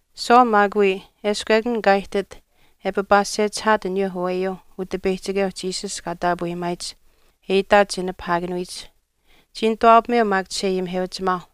Saul maak wii eshkw ekun kaa ihtit e papaasechihaat aniyuu aweyuuh Utipeyihchikeu Jesus kaa taapweyimaayich e itaat che nipahaakanuyich. Chii nituwaapameu maak chisheayimiheuchimaauh,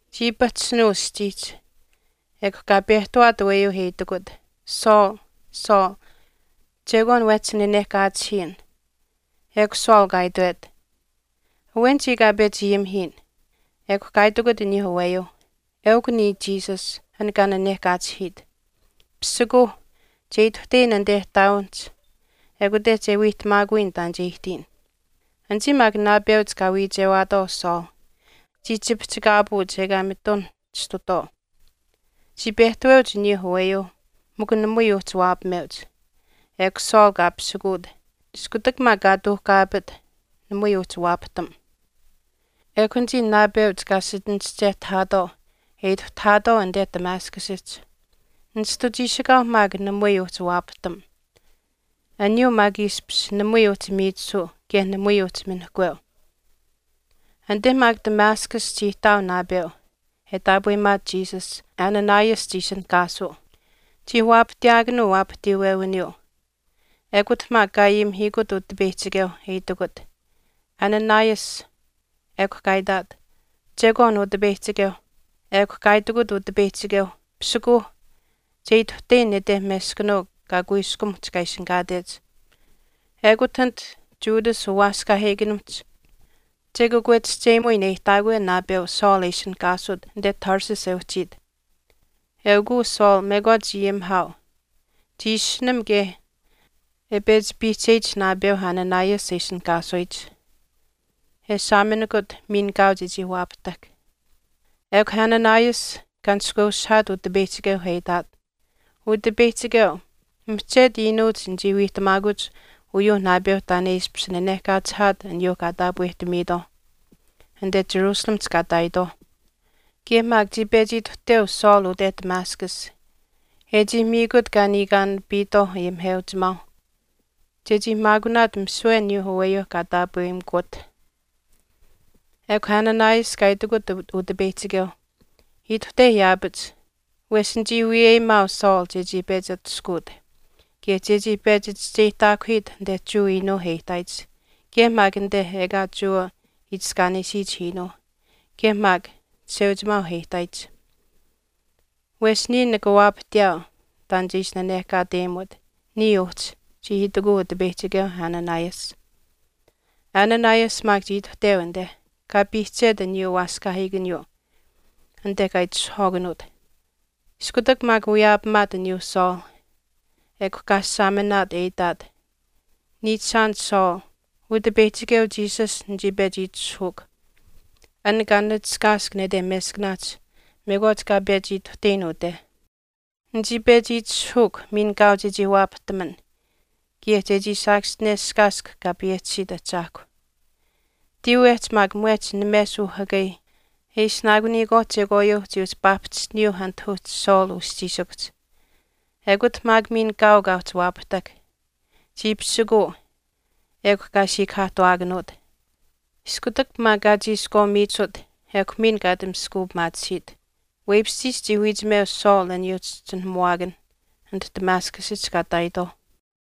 Chii pahchishinuu aschiihch, ekw kaa pehtawaat aweyuu e itikut, “Saul, Saul, chekwaan wehchi nanehkaachihiyin.” Ekw Saul kaa itwet, “Awen chiya kaa pechi ayimihiyin.” Ekw kaa itikut aniyuu aweyuu, “Eukw niya Jesus, an kaa nanehkaachihiit. Pisikuuh, che ituhteyin anite ihtaawinihch ekute che wiihtamaakuyin taan che ihtiyin.” Anichii maak naapeuch kaa wiichewaatwaau Saul chii chipihchikaapuuch ekaa mitun chistutwaau. Chii pehtaweuch aniyuu aweyuu mikw namui uhchi waapameuch. Ekw Saul kaa pisikuut, iskutak maak kaa tuuhkaapit, namui uhchii waapahtam. Ekw anichii naapeuch kaa sichinischehtahaatwaau e ituhtahaatwaau anite Damascusihch. Nishtu chiishikaau maak namui uhchii waapahtam, aniyuu maak ishpish namui uhchi miichisuu kaye namui uhchi minihkweu. Anite maak Damascus chii ihtaau naapeu e taapweyimaat Jesus, Ananias chii ishinihkaasuu. Chii waapahtiyaakanuu waapahtiiwewiniyuu, ekut maak kaa ayimihiikut Utipeyihchikeu e itikut, “Ananias.” Ekw kaa itaat, “Chekwaan Utipeyihchikeu.” Ekw kaa itikut Utipeyihchikeu, “Pisikuuh, che ituhteyin nete meskanuu kaa kuiskumuhch kaa ishinihkaatech. Ekut anit Judas uwaaskaahiikanimihch che kakwechihcheyimuyin e ihtaakwe naapeu Saul e ishinihkaasut anite Tarsus e uhchiit. Eukuu Saul mekwaach ayimihaau. Chii ishinam kaye e pechi piihcheyich naapeu Ananias e ishinihkaasuyich, e saaminikut miin kaau chechii waapahtahk.” Ekw Ananias kaa nishkweushihaat Utipeyihchikeuh e itaat, “Utipeyihchikeu, mihchetu iinuuch nichii wiihtamaakuch uyuu naapeu taan e ishpish nanehkaachihaat aniyuuh kaa taapwehtamitwaau anite Jerusalemihch kaa ihtaayitwaauh. Kaye maak chii pechi ituhteu Saul ute Damascus, e chii miikut kaa niikaanapiitwaau ayimiheuchimaauh chechii maakunaat misiwe aniyuu aweyuu kaa taapweyimikuwat.” Ekw Ananias kaa itikut Utipeyihchikeu, “Ituhte yaapach, wesh nichii wiyeyimaau Saul chechii pechi atushkuut, kaye chechii pechi chischeyihtaakuhiit anite Jewa iinuuh e ihtaayich kaye maak anite ekaa Jewa itiskaanesiyich iinuuh, kaye maak chisheuchimaauh e ihtaayich. Wesh niya nika waapahtiyaau taan che ishi nanehkaateyimut niya uhchi,” chii itikuu Utipeyihchikeu Ananias. Ananias maak chii ituhteu anite, kaa piihchet aniyuu waaskaahiikaniyuu anite kaa itishahwaakanuut. Iskutak maak wiyaapamaat aniyuu Saul, ekw kaa saaminaat e itaat, “Niichishaan Saul, Utipeyihchikeu Jesus nichii pechi itishahuukw, an kaa nachishkaask nete meskaanaahch mekwaach kaa pechi ituhteyin ute. Nichii pechi itishahuukw miin kaau chechii waapahtaman, kaye chechii saakaschineshkaask Kaa payehchisiyich Ahchaahkw.” Tiiwehch maak mwehch names uhakai e ishinaakuniyikwaauh chekwaayuu chii uhchi paahpahchishtiniyuuh anit uhchi Saul uschiishikuhch, ekut maak miin kaau kaa uhchi waapahtahk. Chii pisikuu ekw kaa siikahaahtuwaakanuut. Iskutak maak kaa chiishkwaa miichisut, ekw miin kaa ati maskuupimaatisiit. Weipishchiish chii wiichimeu Saul aniyuu chischinuhamuwaakanh anit Damascusihch kaa ihtaayitwaauh.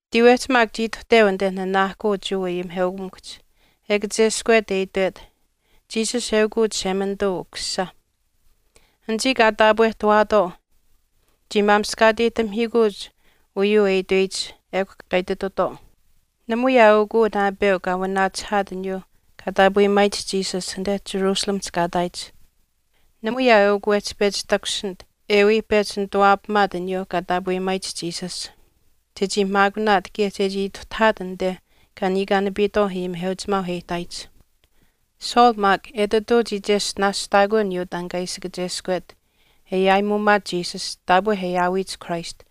Tiiwehch maak chii ituhteu anite nanaahkuu Jewa ayimiheukamikuhch, e kacheskwet e itwet, “Jesus, eukw Chishemanituu Ukusisa.” Anichii kaa pehtawaatwaau, chii maamishkaateyihtamihiikuuch uyuu e itweyich ekw kaa ititutwaau, “Namui aa eukw uu naapeu kaa wanaachihaat aniyuu kaa taapweyimaayich Jesus anite Jerusalemihch kaa ihtaayich. Namui aa eukw uu wehchi pechi takushinit e wii pechi nituwaapamaat aniyuu kaa taapweyimaayich Jesus, chechii maakunaat kaye chechii ituhtahaat anite kaa niikaanapiitwaau ayimiheuchimaauh e ihtaayich.” Saul maak etituu chii cheshtinaashtaakuu aniyuu taan kaa ishi kacheskwet e aayimuumaat Jesus taapwe e aawiyich Christ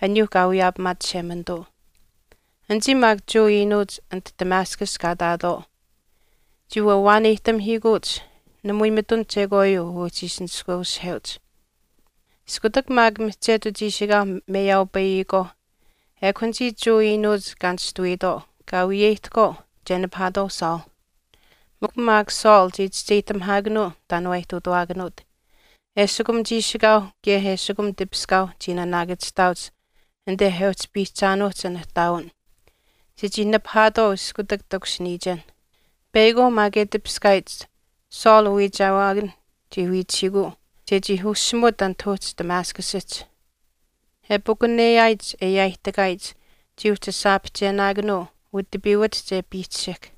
aniyuu kaa wiyaapamaat Chishemanituu. Anichii maak Jewa iinuuch anit Damascus kaa ihtaatwaau chii wawaaneyihtamihiikuuch, namui mitun chekwaayuu uhchii ishi nishkweushiheuch. Iskutak maak mihchetu chiishikaau meyaaupayihkwaau ekw anichii Jewa iinuuch kaa nishtuwiitwaau, kaa wiyeyihtahkwaau che nipahaatwaau Saul. Mikw maak Saul chii chischeyihtamihaakanuu taan waa ihtuutawaakanuut. Eshikum chiishikaau kaye eshikum tipiskaau chii naanaakachihtaauch anite e uhchi piihchaanuuhch an ihtaawin, chechii nipahaatwaau iskutak takushiniyichen. Peyakwaau maak e tipiskaayich Saul uwiichewaakan chii wiichihiikuu chechii ushimut anit uhchi Damascusihch. E pakuneyaayich e yaaihtakaayich chii uhchi aashaapihchenaakanuu utipiiwatihch e piichishihk.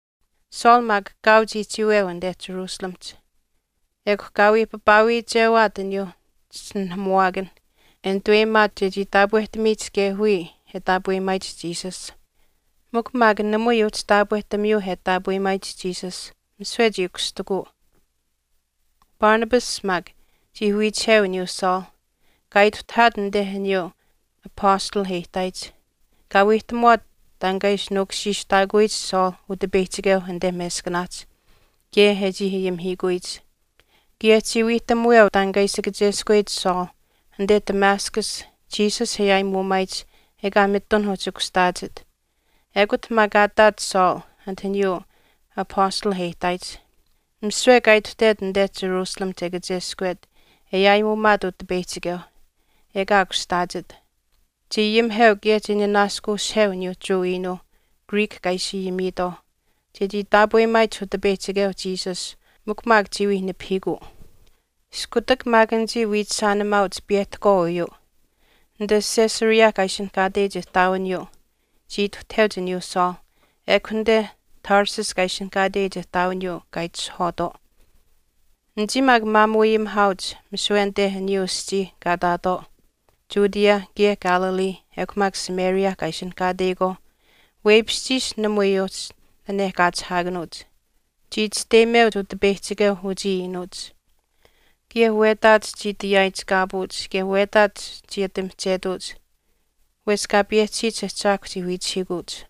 Saul maak kaau chii chiiweu anite Jerusalemihch. Ekw kaa wii papaawiichewaat aniyuu chischinuhamuwaakanh e nituweyimaat chechii taapwehtamiyich kaye wiya e taapweyimaayich Jesus. Mikw maak namui uhchi taapwehtamiyuu e taapweyimaayich Jesus, misiwe chii kushtikuu. Barnabas maak chii wiichiheu aniyuu Saul, kaa ituhtahaat anite aniyuu apastalh e ihtaayich. Kaa wiihtamuwaat taan kaa ishi nuukushiishtaakuyich Saul Utipeyihchikeu anite meskanaahch, kaye e chii ayimihiikuyich. Kaye chii wiihtamuweu taan kaa ishi kacheskweyich Saul anite Damascus Jesus e aayimuumaayich ekaa mitun uhchi kushtaachit. Ekut maak kaa ihtaat Saul anit aniyuu apastalh e ihtaayich. Misiwe kaa ituhtet anite Jerusalemihch e kacheskwet e aayimuumaat Utipeyihchikeu, ekaa kushtaachit. Chii ayimiheu kaye chii nanaaskuushiheu aniyuu Jewa iinuuh Greek kaa ishi ayimiitwaauh chechii taapweyimaayich Utipeyihchikeu Jesus mikw maak chii wii nipahiikuu. Iskutak maak anichii wiichishaanimaauch piyehtahkwaau uyuu, anite Caesarea kaa ishinihkaateyich ihtaawiniyuu chii ituhtaheuch aniyuu Saul, ekw anite Tarsus kaa ishinihkaateyich ihtaawiniyuu kaa itishahwaatwaau. Anichii maak umaamuuayimihaauch misiwe anite aniyuuh aschiih kaa ihtaatwaau Judea kaye Galilee ekw maak Samaria kaa ishinihkaateyikwaauh, weipishchiish namui uhchi nanehkaachihaakanuuch. Chii chisteyimeuch Utipeyihchikeu uchii iinuuch kaye wetaach chii ati yaaichikaapuuch kaye wetaach chii ati mihchetuuch wesh Kaa payehchisiyich Ahchaahkwa chii wiichihiikuuch.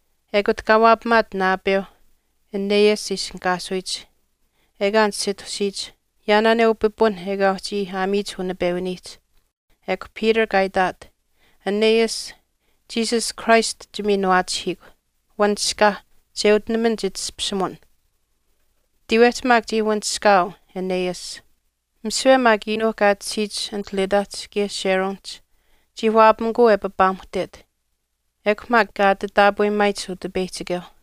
ekut kaa waapamaat naapeu Aeneas e ishinihkaasuyich, ekaa nisitusiyich, yaanaaneu pipun ekaa uhchi aamiyich unipewiniihch. Ekw Peter kaa itaat, “Aeneas, Jesus Christ chimiinuwaachihiikw, wanishkaa, che utinaman chitashpishimun.” Tiiwehch maak chii wanishkaau Aeneas. Misiwe maak iinuuh kaa tashiyich anit Lyddahch kaye Sharonihch chii waapamikuu e papaamuhtet, ekw maak kaa ati taapweyimaayich Utipeyihchikeuh.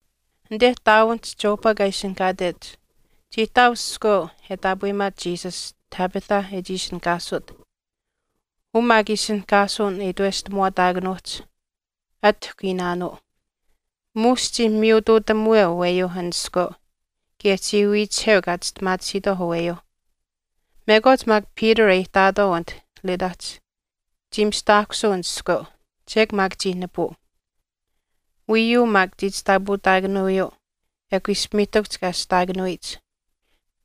Anite ihtaawinihch Joppa kaa ishinihkaatech chii ihtaau iskweu e taapweyimaat Jesus, Tabitha e chii ishinihkaasut, uu maak ishinihkaasuwin e itweshtamaataakanuuhch atihkw iinaanuu. Muush chii miyutuutamuweu aweyuu an iskweu kaye chii wiichiheu kaa chistimaatisiitwaau aweyuuh. Mekwaach maak Peter e ihtaat anit Lyddahch, chii mistaahkusuu an iskweu, chek maak chii nipuu. Wiiyuu maak chii chishtaapautaakanuuyuu, ekw ishpimiihtakuhch kaa ashtaakanuyich.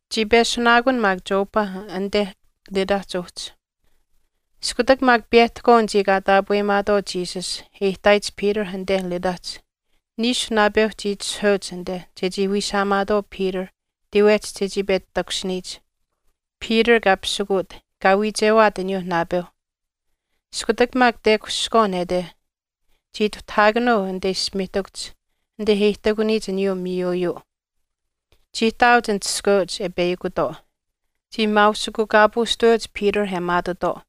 Chii peshunaakun maak Joppa anite Lyddahch uhchi. Iskutak maak piyehtahkwaau anichii kaa taapweyimaatwaau Jesus e ihtaayich Peter anite Lyddahch, niishu naapeu chii itishahweuch anite chechii wiishaamaatwaau Peter tiiwehch chechii pechi takushiniyich. Peter kaa pisikuut, kaa wiichewaat aniyuu naapeuh. Iskutak maak tekushihkwaau nete, chii ituhtahaakanuu anite ishpimiihtakuhch anite e ihtakuniyich aniyuu miiyuuyuu. Chii ihtaauch anit iskweuch e peyakutwaau, chii maausikukaapuushtaweuch Peter e maatutwaau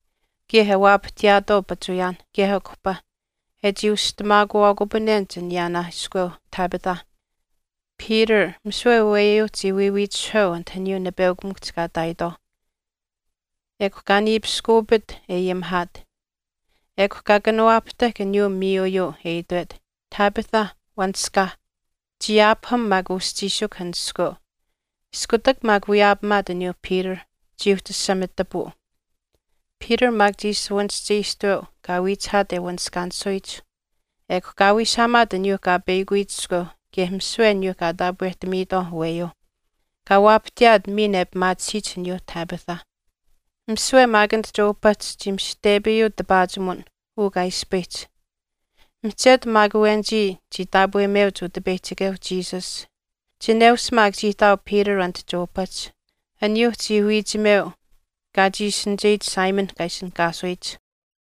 kaye e waapahtiyaatwaau pachuuyaanh kaye akuhpa e chii ushtamaakuwaakupanenich aniyaanaa iskweu Tabitha. Peter misiwe aweyuuh chii wiiwiitishiheu anit aniyuu nipeukamikuhch kaa ihtaayitwaauh, ekw kaa niipiskuupit e ayimihaat, ekw kaa kanawaahtahk aniyuu miiyuuyuu e itwet, “Tabitha, wanishkaa.” Chii aapaham maak uschiishikuh an iskweu, iskutak maak wiyaapamaat aniyuu Peter, chii uhchi asamitapuu. Peter maak chii shuwanischeyishtuweu kaa wiichihaat e wanishkaanisuyich. Ekw kaa wiishaamaat aniyuu kaa peyakuyich iskweuh kaye misiwe aniyuu kaa taapwehtamiitwaauh aweeyuuh, kaa waapahtiyaat miin e pimaatisiyich aniyuu Tabitha. Misiwe maak anit Joppahch chii mishihtepayuu tipaachimuwin uu kaa ispayihch. Mihchetu maak awenichii chii taapweyimeuch Utipeyihchikeu Jesus. Chineush maak chii ihtaau Peter anit Joppahch, aniyuu chii wiichimeu kaa chiishinicheyich Simon kaa ishinihkaasuyich.